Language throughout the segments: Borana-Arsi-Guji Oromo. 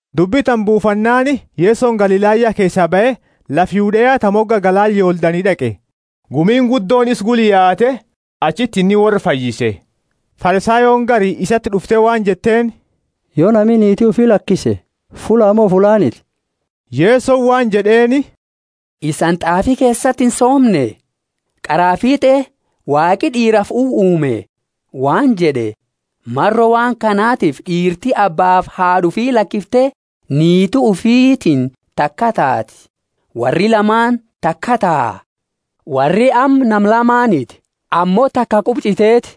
Dubbi tana buufannaani, Yesoni Galilaya keesaa bahe, lafa Yudea ta moga galaana Yordani d'aqe. Gumiini guddooni isa gula yaate, achiti inni worra fayyise. Farisayooni gari isati d'ufte waan jetteeni, Yo nami niiti ufi lakise fullaa mo fullaaniti? Yesoni waan jed'eeni, Isani t'aafi keesati insoomne? Qaraa fiit'e Waaqi d'iirafi uwa uume waan jed'e, Maro waan kanatifi d'iirti abbaafi haad'a ufi lakifte niiti ufitiini taka taati, worri lamaani takaa taha. Worri amma nama lamaaniti, ammo taka quba ch'iteeti.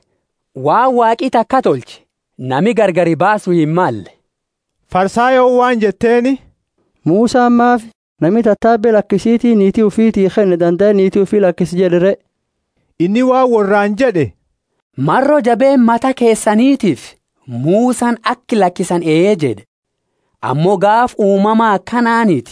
Waan Waaqi takaa tolche nami gargari baasu himmalle. Farisayooni waan jetteeni, Musani maafi, Nami tatabe lakisiti niiti ufiti kenne dandae niiti ufi illakisa jed'e re? Inni waan worraani jed'e, Maro jabeenna mata keesanitiifi Musani aka lakisani ee jed'e; ammo gaafa uumama akanaaniti.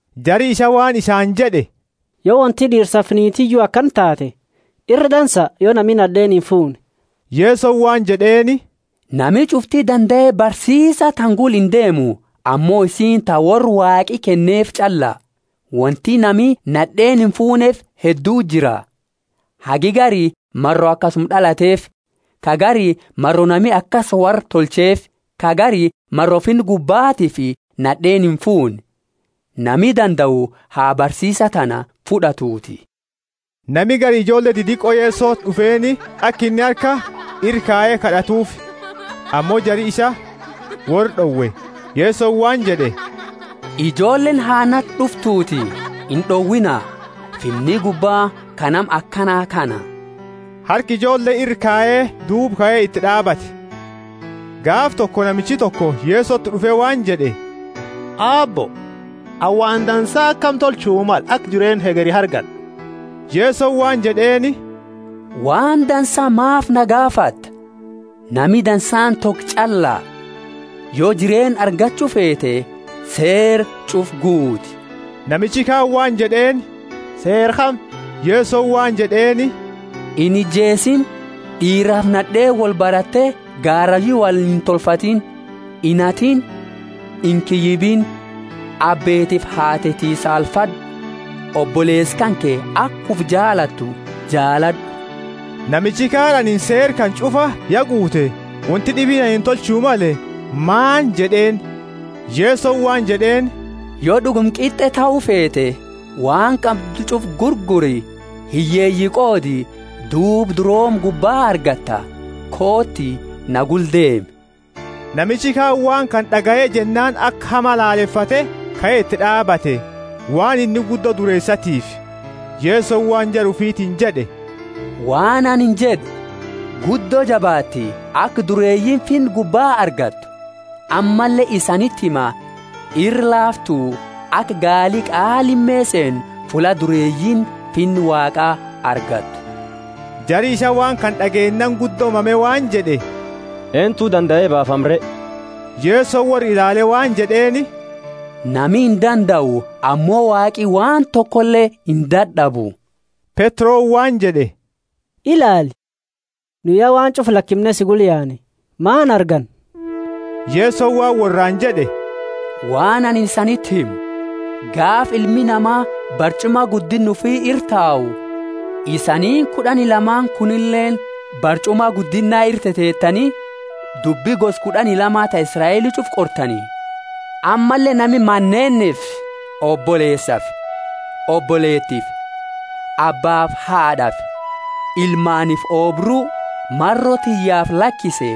Jari isaa waan isaani jed'e, Yo wonti d'iirsafi niitiyu akana taate, ira dansa yo nami nad'eeni imfuune. Yesoni waan jed'eeni, Nami ch'ufti dandae barsiisa tana gula indeemu, ammo isiini ta worra Waaqi kenneefi ch'alla. Wonti nami nad'eeni imfuuneefi hedduti jira: hagi gari maro akasuma d'alateefi; ka gari maro nami akasi worra tolcheefi; ka gari maro Finna gubbatiifi nad'eeni imfuune. Nami dandau ha barsiisa tana fud'atuuti. Nami gari ijoolle didiqo Yesoti d'ufeeni, aka inni harka ira kaye kad'atuufi. Ammo jari isaa worra d'owe. Yesoni waan jed'e, Ijoolleeni ha nati d'uftuuti, ind'owiina, Finni gubba ka nama akana kana. Harka ijoolle ira kaye duuba kae iti d'aabate. Gaafa toko, namichi toko Yesoti d'ufe waan jed'e, Aabbo, anini waan dansa akami tolchu male aka jireenna hegeri argad'u? Yesoni waan jed'eeni, Waan dansaa maafi na gaafatta? Nami dansaani toko ch'alla. Yo jireenna argachu feete, seera ch'ufa guuti. Namichi kaani waan jed'eeni, Seera kami? Yesoni waan jed'eeni, Inijeesiini d'iirafi nad'eeni wolbarate gaarayu wolintolfatini; inhatiini; inkiyyibiini; abbeetiifi haateti saalfad'u oboleesa kanke aka ufi jaalatu jaalad'u. Namichi kaani, Anini seera kana ch'ufa ya guute; wonti d'ibiini anini tolchu male maani? jed'eeni. Yesoni waan jed'eeni, Yo d'uguma qit'e tahu feete, waan qabdu ch'ufa gurguri, hiyyeeyi qoodi, duuba durooma gubba argatta, kooti na gula deemi. Namichi kaani waan kana d'agaye jennaani aka hama lalefate kae iti d'aabate, waan inni guddo dureesatiifi. Yesoni waan jara ufitiini jed'e, Waan anini jed'u, Guddo jabaatti, aka dureeyiini Finna gubba argattu. Ammalle isaniti hima, Ira laaftu aka gaali qaa lime seenu, fulla dureeyiini Finna Waaqa argattu. Jari isaa waan kana d'ageennaani guddo mame waan jed'e, Eentu dandae baafama re? Yesoni worra ilaale waan jed'eeni, Nami indandau, ammo Waaqi waan tokole indad'abu. Petroni waan jed'e, Ilaali, nu ya waan ch'ufa lakimne si gula yaane, maani arganna? Yesoni waan worraani jed'e, Waan anini isaniti himu, Gaafa Ilmi Nama barch'uma guddinna ufi ira tau, isaniini kud'ani lamaani kunileeni barch'uma guddinna ira teteetani, dubbi gosa kud'ani lama ta Israeli ch'ufa qortani. Ammalle nami maneenifi oboleesafi oboleetifi, abbaafi haad'afi, ilmaaniifi oobru, maro tiyyaafi lakise,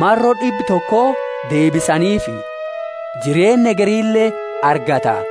maro d'ibba toko deebisaniifi, jireenna hegerile argata.